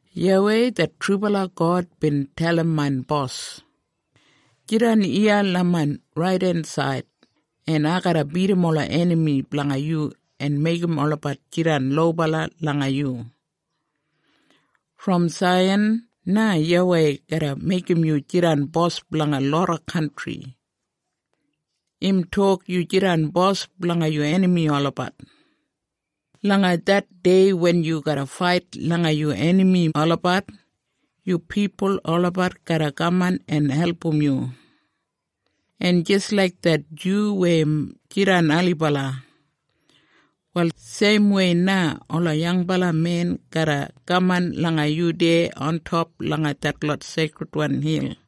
YAWEI det trubala God bin dalim main Bos, “Jidan iya langa main raidensaid en ai garra bidim ola enami blanga yu en meigim olabat jidan lobala langa yu.” Brom Saiyan na YAWEI garra meigim yu jidan bos blanga loda kantri. Im tok, “Yu jidan bos blanga yu enami olabat.” Langa det dei wen yu garra fait langa yu enami olabat, yu pipul olabat garra kaman en album yu. En jis laik det dyu weya im jidan ailibala, wal seimwei na ola yangbala men garra kaman langa yu deya ontop langa detlot seikridwan hil.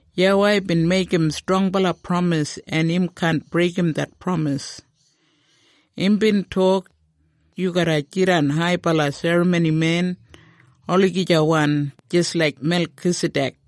YAWEI bin meigim strongbala pramis en im kaan breigim det pramis. Imbin tok, “Yu garra jidan haibala serramonimen olagijawan jis laik Melkisadek.”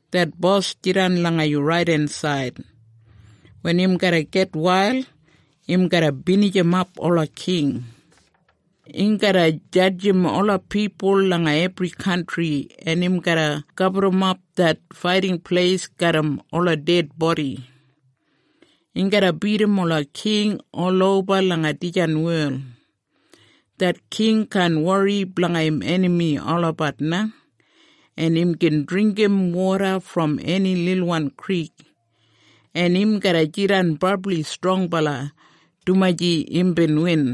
Det Bos jidan langa yu raidensaid. Wen im garra gitwail im garra binijimap ola king. Im garra jadjim ola pipul langa ebri kantri, en im garra gaburrumap det faiting pleis garram ola ded bodi. Im garra bidim ola king oloba langa dijan wel. Det king kaan wori blanga im enami olabat na, en im gin dringgim woda brom eni lilwan krik. En im garra jidan brabli strongbala dumaji imbin win.